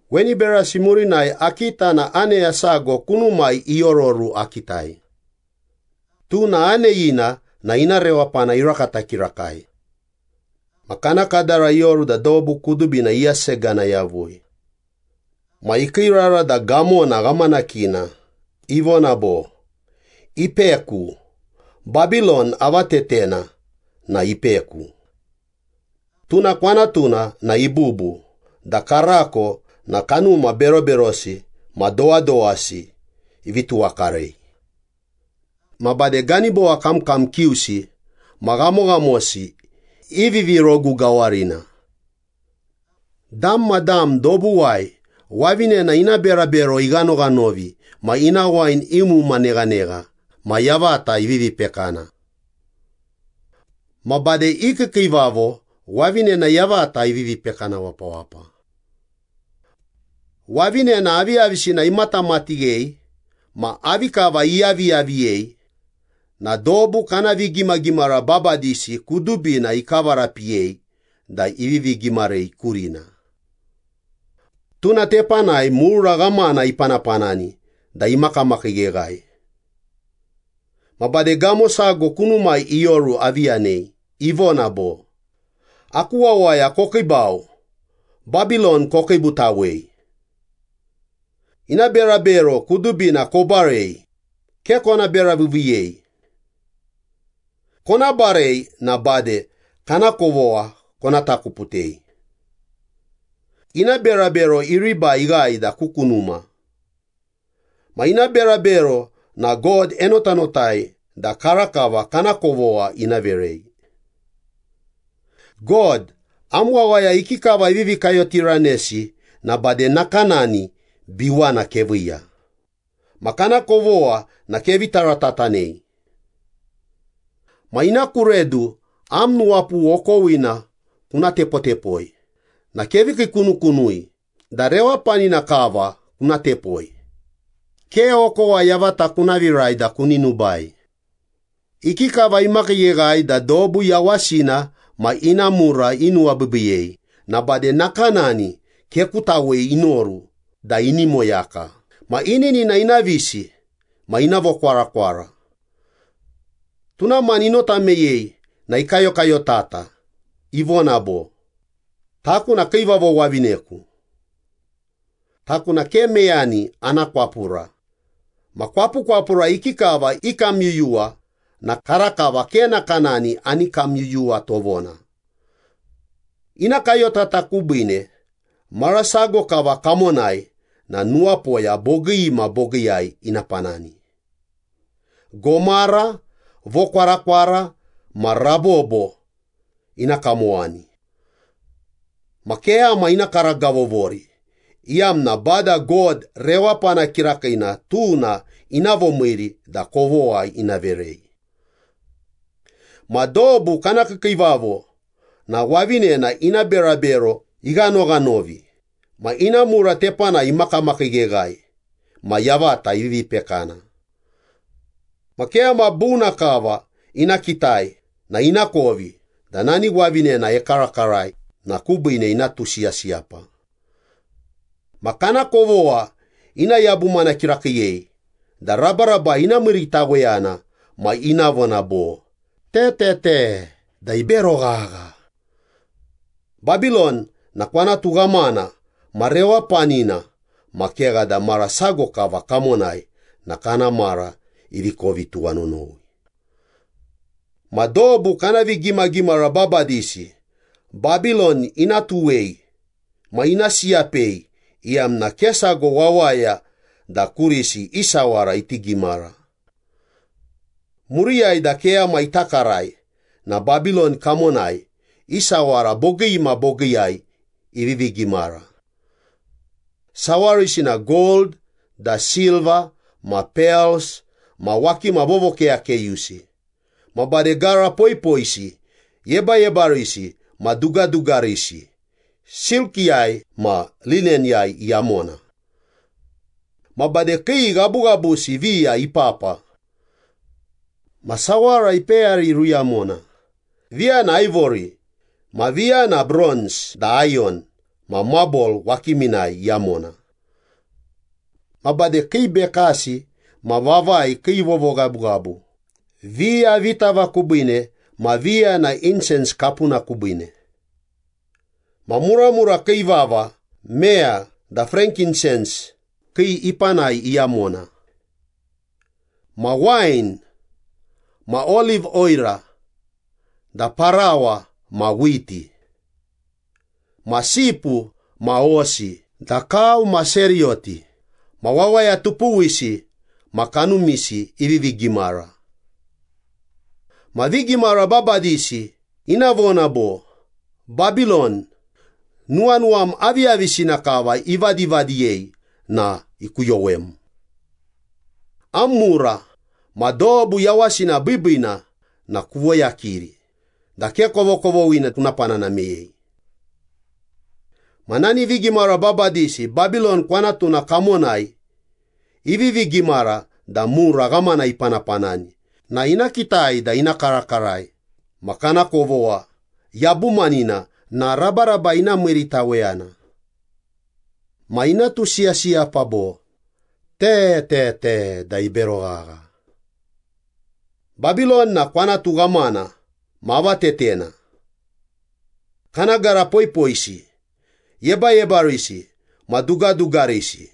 Weni berasi murinai akita na aneya sago kunumai iororu akitai. Tuna aneyina na ina rewapana irakata kirakai. Ma kana kadara ioru da dobu kudubina iyasegana yavui. Ma ikiirara da gamona ghamanakina, ivona bo, “Ipeku. Babilon avatetena na ipeku. Tuna kwanatuna na ibubu da karako na kanuma beroberosi ma dowadowasi ivi tuwakarei. Ma bade ganibowa kamkam kiusi ma ghamoghamosi i vivirogu gawarina. Dam ma dam dobuwai wavinena ina berabero ighanoghanovi ma ina wain iumuma neghanegha ma yavata ivivi pekana. Ma bade i kiikiivavo wavinena yavata ivivi pekana wapawapa. Wavinena aviyavisina imatamatighei ma avi kava iyaviyaviyei na dobu kana vigimagimara babadisi kudubina ikavarapiyei da ivivi gimarei kurina. Tuna tepanai mura ghamana ipanapanani da imakamakiigheghae.” Ma bade gamo sago kunumai ioru avi yanei, ivona bo, “Aku wawaya, kokiibau. Babilon kokiibutawei. Ina berabero kudubina kobarei, ke kona beraviiviiyei. Kona barei na bade kana kovogha kona takuputei. Ina berabero iribai ighae da ku kunuma. Ma ina berabero na God enotanotai da karakava kana kovogha ina verei.” “God, am wawaya ikikava ivivi kayotiranesi na bade nakanani biwana keviiya, ma kana kovogha na kevi taratatanei. Ma ina ku redu am nuwapughu okowina kuna tepotepoi na kevi kiikunukunui da rewapanina kava kuna tepoi, ke okowa yavata kuna virai da kuni nubai. Ikikava imakiigheghae da dobu yawasina ma ina mura inuwabiibiiyei na bade nakanani kekutawei inoru da ini moyaka ma ininina ina visi ma ina vokwarakwara. Tuna mani inota meyei na ikayokayotata ivona bo, ‘Taku na kiivavo wavineku. Taku na ke meyani ana kwapura ma kwapukwapura ikikava ikamyuyuwa na karakava ke nakanani ani kamyuyuwa tovona.’” “Ina kayotata kubiine mara sago kava kamonai na nuwapoya bogii ma bogiiyai ina panani. Gomara, vokwarakwara ma rabobo ina kamowani. Ma keyama ina karagavovori, iyamna Bada God rewapana kirakiina tuna ina vomiiri da kovogha ina verei.” Ma dobu kana kiikiivavo na wavinena ina berabero ighanoghanovi ma ina mura tepanai imakamakiigheghae ma yavata ivivi pekana. Ma keyama buna kava ina kitai na inakovi da nani wavinena ekarakarai na kubiine ina tusiyasiyapa. Ma kana kovogha ina yabumana kirakiiyei da rabarabai ina miiritaweyana ma ina vona bo, “Te, te, te, da ibero ghagha. Babilon na kwanatu ghamana ma rewapanina ma kegha da mara sago kava kamonai na kana mara ivi kovi tuwanonowi.” Ma dobu kana vigimagimara babadisi Babilon ina tuwei ma ina siyapei iyamna ke sago wawaya da kurisi i sawara iti gimara. Muriyai da keyama ita karai na Babilon kamonai i sawara bogii ma bogiiyai ivivi gimara. Sawarisi na gold, da silva ma pels ma wakima vovokeyakeyusi. Ma bade gara poipoisi, yebayebarisi ma dugadugarisi, silkiyai ma lineniyai iyamona. Ma bade kii ghabughabusi viya ipapa. Ma sawara ipeyari iruyamona, viya na aivori ma viya na bronz da ayon ma mabol wakiminai iyamona. Ma bade kii bekasi ma vavai kii vovoghabughabu, viya vitava kubiine ma viya na insens kapuna kubiine. Ma muramura kii vava meya da frankinsens kii ipanai iyamona. Ma wain ma oliv oira da parawa ma whiti. Ma sipu ma hosi da kau ma seriyoti ma wawaya tupuwisi ma kanumisi ivivi gimara. Ma vigimara babadisi ina vona bo, “Babilon, nuwanuwam aviyavisina kava ivadivadiyei na ikuyowem. Am mura ma dobu yawasina biibiina na kuvoyakiri da ke kovokovoghina kuna panana meyei.” Ma nani vigimara babadisi Babilon kwanatuna kamonai ivivi gimara da mura ghamana ipanapanani na ina kitai da ina karakarai ma kana kovogha yabumanina na rabarabai ina miiritaweyana. Ma ina tusiyasiyapa bo, “Te, te, te, da ibero ghagha. Babilon na kwanatu ghamana ma avatetena. Kana gara poipoisi, yebayebarisi ma dugadugarisi,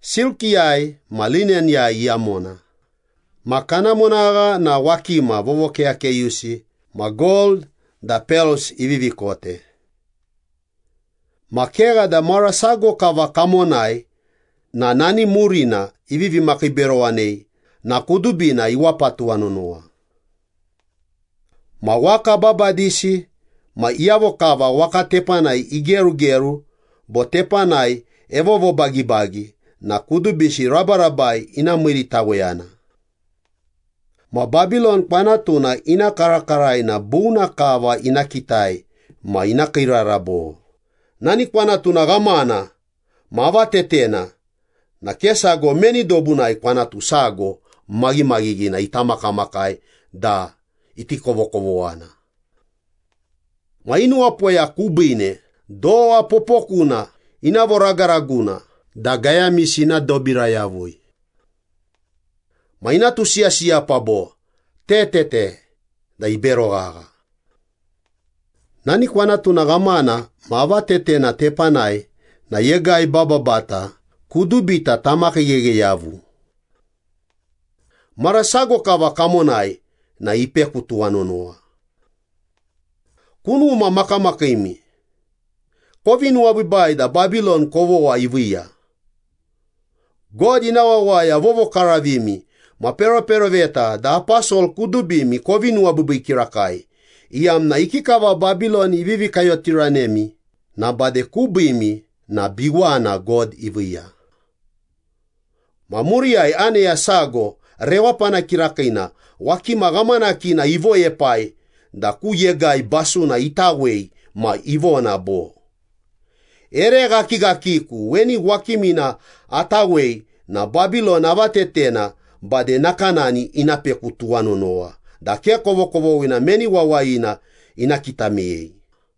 silkiyai ma lineniyai iyamona, ma kana monagha na wakima vovokeyakeyusi ma gold da pels ivivi kote. Ma kegha da mara sago kava kamonai na nani murina ivivi makiiberowanei na kudubina iwapa tuwanonowa.” Ma waka babadisi ma iyavo kava waka tepanai igerugeru bo tepanai evovobagibagi na kudubisi rabarabai ina miiritaweyana. Ma Babilon kwanatuna ina karakarai na buna kava ina kitai ma ina kiirara bo, “Nani kwanatuna ghamana ma avatetena na ke sago meni dobunai kwanatu sago maghimaghighina ita makamakai da iti kovokovoghana.” Ma i nuwapoya kubiine dowa popokuna ina voragaraguna da gayamisi ina dobira yavui. Ma ina tutusiyasiyapa bo, “Te, te, te, da ibero ghagha. Nani kwanatuna ghamana ma avatetena tepanai na yegai bababata kudubita tamakiigheghe yavu. Mara sago kava kamonai na ipeku tuwanonowa.” “Kunuma makamakiimi, kovi nuwabiibai da Babilon kovogha iviiya. God ina wawaya vovokaravimi ma peroperoveta da aposol kudubimi kovi nuwabiibii kirakai, iyamna ikikava Babilon ivivi kayotiranemi na bade kubiimi na biwana God iviiya.” Ma muriyai aneya sago rewapana kirakiina wakima ghamanakina ivoepai da ku yegai basuna itawei ma ivona bo, “Ere ghakighakiku weni wakimina atawei na Babilon avatetena bade nakanani ina peku tuwanonowa da ke kovokovoghina meni wawayina ina kita meyei.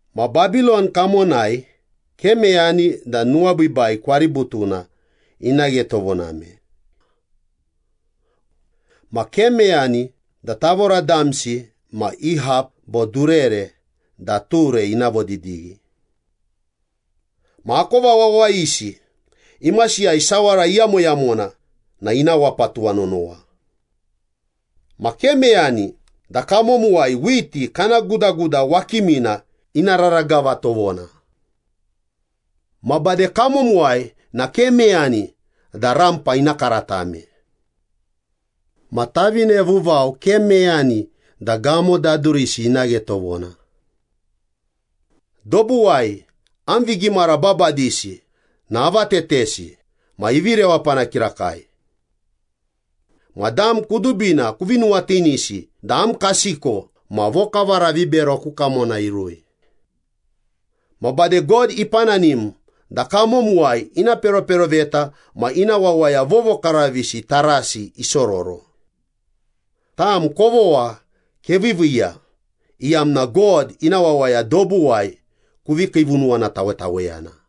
Ma Babilon kamonai ke meyani da nuwabiibii kwaributuna ina ghe tovoname. Ma ke meyani da tavora damsi ma i hap bo durere da ture ina vodidighi. Ma akova wawayisi imasiyai sawara iyamoyamona na ina wapa tuwanonowa. Ma ke meyani da kamomuwai whiti kana gudaguda wakimina ina raragava tovona. Ma bade kamomuwai na ke meyani da rampa ina karatame. Ma tavine vuvau ke meyani da gamo dadurisi ina ghe tovona. Dobuwai am vigimara babadisi na avatetesi ma ivi rewapana kirakai. Ma dam kudubina kuvi nuwatinisi da am kasiko ma vokavara vibero ku kamona irui. Ma bade God ipananim da kamomuwai ina peroperoveta ma ina wawaya vovokaravisi tarasi isororo. Tam kovogha keviiviiya, iyamna God ina wawaya dobuwai kuvi kiivunuwanatawetaweyana.”